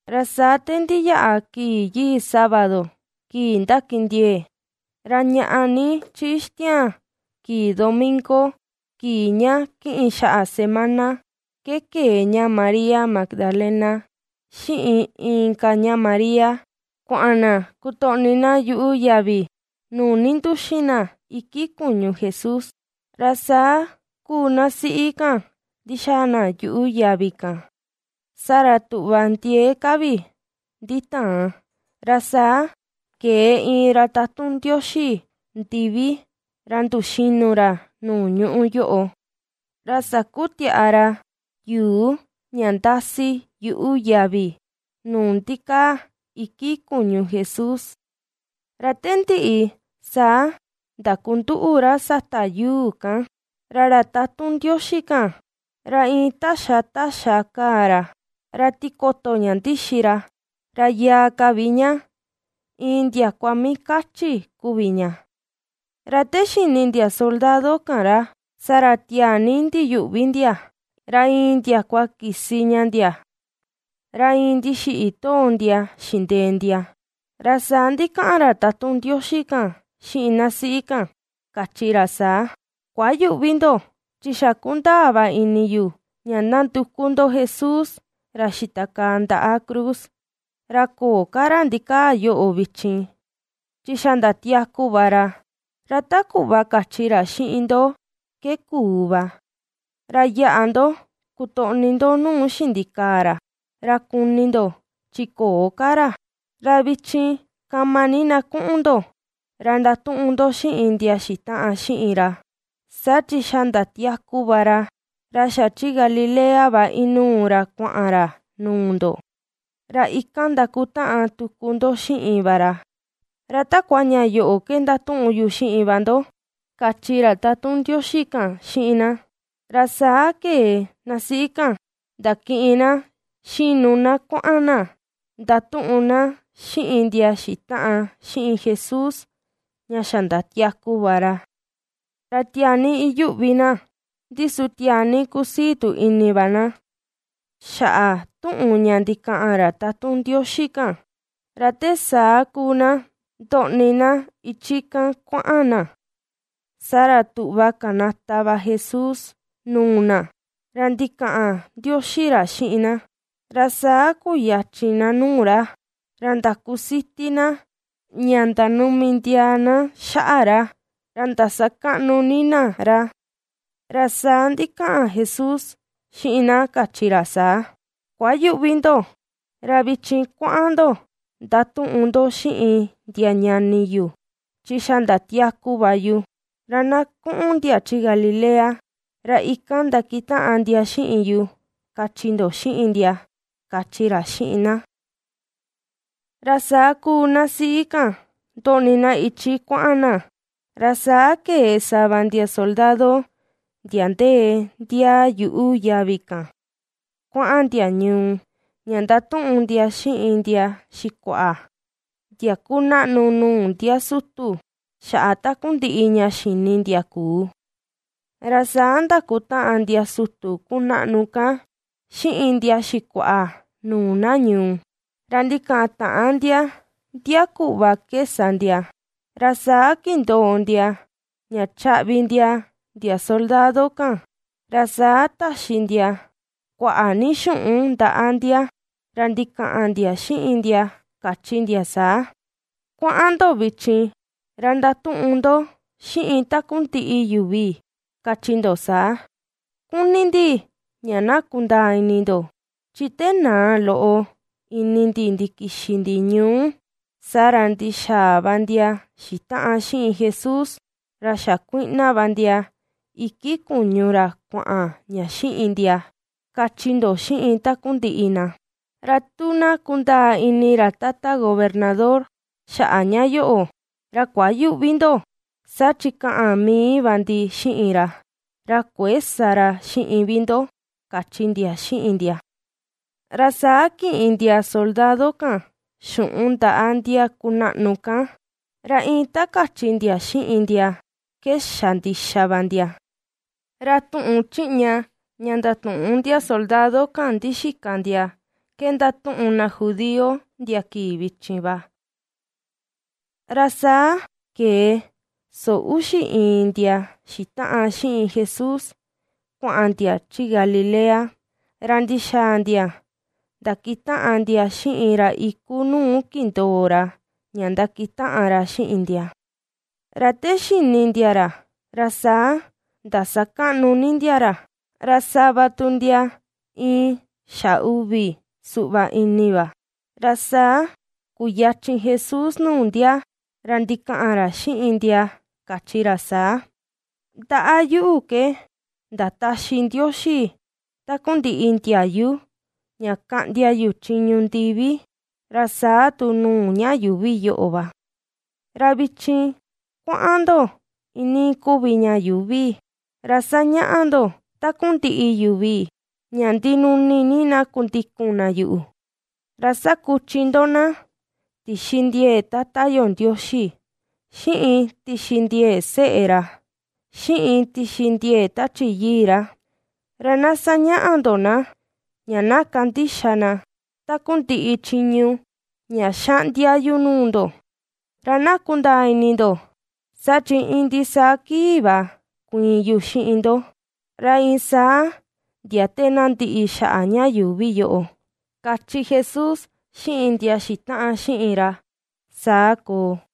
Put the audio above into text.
Ra saa te ndiyaꞌa kii yii sábado, kii ndakindiee, ra ñaꞌa ni chi ixtiaan kii domingo, kii ña kiꞌin xaꞌa semana, ke kee ña María Magdalena, xiꞌin inka ña María kuaꞌan na kutoꞌni na yuꞌu yavi nuu ninduxin na iki kuñu Jesús. Ra saa kuu na siꞌi kan ndixaa na yuꞌu yavi kan, saa ra tuꞌva ndiee ka vi nditaan. Ra saa kee iin ra tatun Ndioxi ndivi ra nduxinu ra, nuu ñuꞌu yoꞌo, ra sakutiaꞌa ra yuu ña ndasi yuꞌu yavi nuu ndikaa iki kuñu Jesús, ra te ndiꞌi saa ndakunduꞌu ra sata yuu kan. Ra ra tatun Ndioxi kan, ra iin taxa taxa kaa ra, ra tikoto ña ndixi ra, ra yaa ka vi ña, iin ndiakua mii kachi kuvi ña. Ra te xini ndia soldado kan ra, saa ra tiaa ni ndiyuꞌvi ndia ra iin ndiakua kisi ña ndia, ra iin ndixiꞌi too ndia xindee ndia. Ra saa ndikaꞌan ra tatun Ndioxi kan xiꞌin na siꞌi kan, kachi ra saa: ―Kuayüꞌvi ndo, chi xa kundaa va ini yu ña nanduku ndo Jesús, ra xitakaa ndaꞌa cruz. Ra köo ka ra ndikaa yoꞌo vichin, chi xa ndatiaku va ra, ra ta kuꞌva kachi ra xiꞌin ndo ke kuu va. Ra yaꞌa ndo kutoꞌni ndo nuu xindikaa ra, ra kuni ndo chi köo ka ra. Ra vichin kama ni na kuꞌun ndo, ra ndatuꞌun ndo xiꞌin ndia xitaꞌan xiꞌin ra: “Saa chi xa ndatiaku va ra, ra xa chi Galilea va inuu ra kuaꞌan ra nuu ndo, ra ikan ndakutaꞌan tuku ndo xiꞌin va ra.” Ra takua ña yoꞌo ke ndatuꞌun yu xiꞌin va ndo ―kachi ra tatun Ndioxi kan xiꞌin na. Ra saa kee na siꞌi kan ndakiꞌin na xinu na kuaꞌan na ndatuꞌun na xiꞌin ndia xitaꞌan xiꞌin Jesús, ña xa ndatiaku va ra. Ra tiaa ni iyuꞌvi na, ndi su tiaa ni kusii tu ini va na xaꞌa tuꞌun ña ndikaꞌan ra tatun Ndioxi kan. Ra te saa kuu na ndoꞌni na ichi kan kuaꞌan na, saa ra tuꞌva kanata va Jesús nuu na, ra ndikaꞌan ndioxi ra xiꞌin na. Ra saa kuyachin na nuu ra, ra ndakusiti na ña ndanumi ndiaa na xaꞌa ra, ra ndasakaꞌnu ni na ra. Ra saa ndikaꞌan Jesús xiꞌin na kachi ra saa: ―Kuayüꞌvi ndo, ra vichin kuaꞌan ndo ndatuꞌun xiꞌin ndia ñani yu, chi xa ndatiaku va yu, ra na kuꞌun ndia chi Galilea, ra ikan ndakitaꞌan ndia xiꞌin yu, kachi ndo xiꞌin ndia ―kachi ra xiꞌin na. Ra saa kuu na siꞌi kan ndoꞌni na ichi kuaꞌan na, ra saa kee sava ndia soldado, ndia ndee ndiaa yuꞌu yavi kan kuaꞌan ndia ñuu, ña ndatuꞌun ndia xiꞌin ndia xikuaꞌa, ndia kunaꞌnu nuu ndia sutu xaꞌa takundiꞌi ña xini ndia kuu. Ra saa ndakutaꞌan ndia sutu kunaꞌnu kan xiꞌin ndia xikuaꞌa nuu na ñuu, ra ndikataꞌan ndia ndia kuꞌva ke sa ndia, ra saa kindoo ndia ña chaꞌvi ndia ndia soldado kan, ra saa taxi ndia kuaꞌa ni xuꞌun ndaꞌa ndia, ra ndikaꞌan ndia xiꞌin ndia kachi ndia saa: ―Kuaꞌan ndo vichin ra ndatuꞌun ndo xiꞌin takundiꞌi yuvi kachi ndo saa: “Kuni ndi ña na kundaa ini ndo, chi te naa loꞌo ini ndi ndikixi ndi ñuu, saa ra ndixaa va ndia xitaꞌan xiꞌin Jesús, ra xakuiꞌna va ndia iki kuñu ra kuaꞌan ña xiꞌin ndia”, kachi ndo xiꞌin takundiꞌi na. Ra tu na kundaa ini ra tata gobernador xaꞌa ña yoꞌo, ra kuayüꞌvi ndo, saa chi kaꞌan mii va ndi xiꞌin ra, ra kuëe sa ra xiꞌin vi ndo ―kachi ndia xiꞌin ndia. Ra saa kiꞌin ndia soldado kan xuꞌun ndaꞌa ndia kunaꞌnu kan, ra iin ta kachi ndia xiꞌin ndia ke xa ndixa va ndia. Ra tuꞌun chiꞌña ña ndatuꞌun ndia soldado kan ndixika ndia ke ndatuꞌun na judío ndia kii vichin va. Ra saa kee soo uxi iin ndia xitaꞌan xiꞌin Jesús kuaꞌan ndia chi Galilea, ra ndixaa ndia ndakitaꞌan ndia xiꞌin ra iku nuu kindoo ra ña ndakitaꞌan ra xiꞌin ndia. Ra te xini ndia ra, ra saa ndasakaꞌnu ni ndia ra, ra sava tu ndia iin xa uvi suꞌva ini va. Ra saa kuyachin Jesús nuu ndia, ra ndikaꞌan ra xiꞌin ndia kachi ra saa: ―Ndaꞌa yuꞌu ke ndataxi Ndioxi takundiꞌi ndiayu ña kaꞌndia yu chiñu ndivi, ra saa tu nuu ña yuuvi yoꞌo va. Ra vichin kuaꞌan ndo iinii kuvi ña yuuvi, ra sañaꞌa ndo takundiꞌi yuvi ña ndinuni ni na kundikun na yuꞌu, ra sakuchi ndo na tixi ndiee Tata yo Ndioxi, xiꞌin tixi ndiee Seꞌe ra, xiꞌin tixi ndiee Tachi Yii ra, ra na sañaꞌa ndo na, ña na kandixa na takundiꞌi chiñu ña ^xaꞌndia yu nuu ndo. Ra na kundaa ini ndo, saa chi iin ndisaa kii va kuiin yu xiꞌin ndo, ra iin saa ndia te na ndiꞌi xaꞌa ña yuuvi yoꞌo ―kachi Jesús xiꞌin ndia xitaꞌan xiꞌin ra. Saa koo.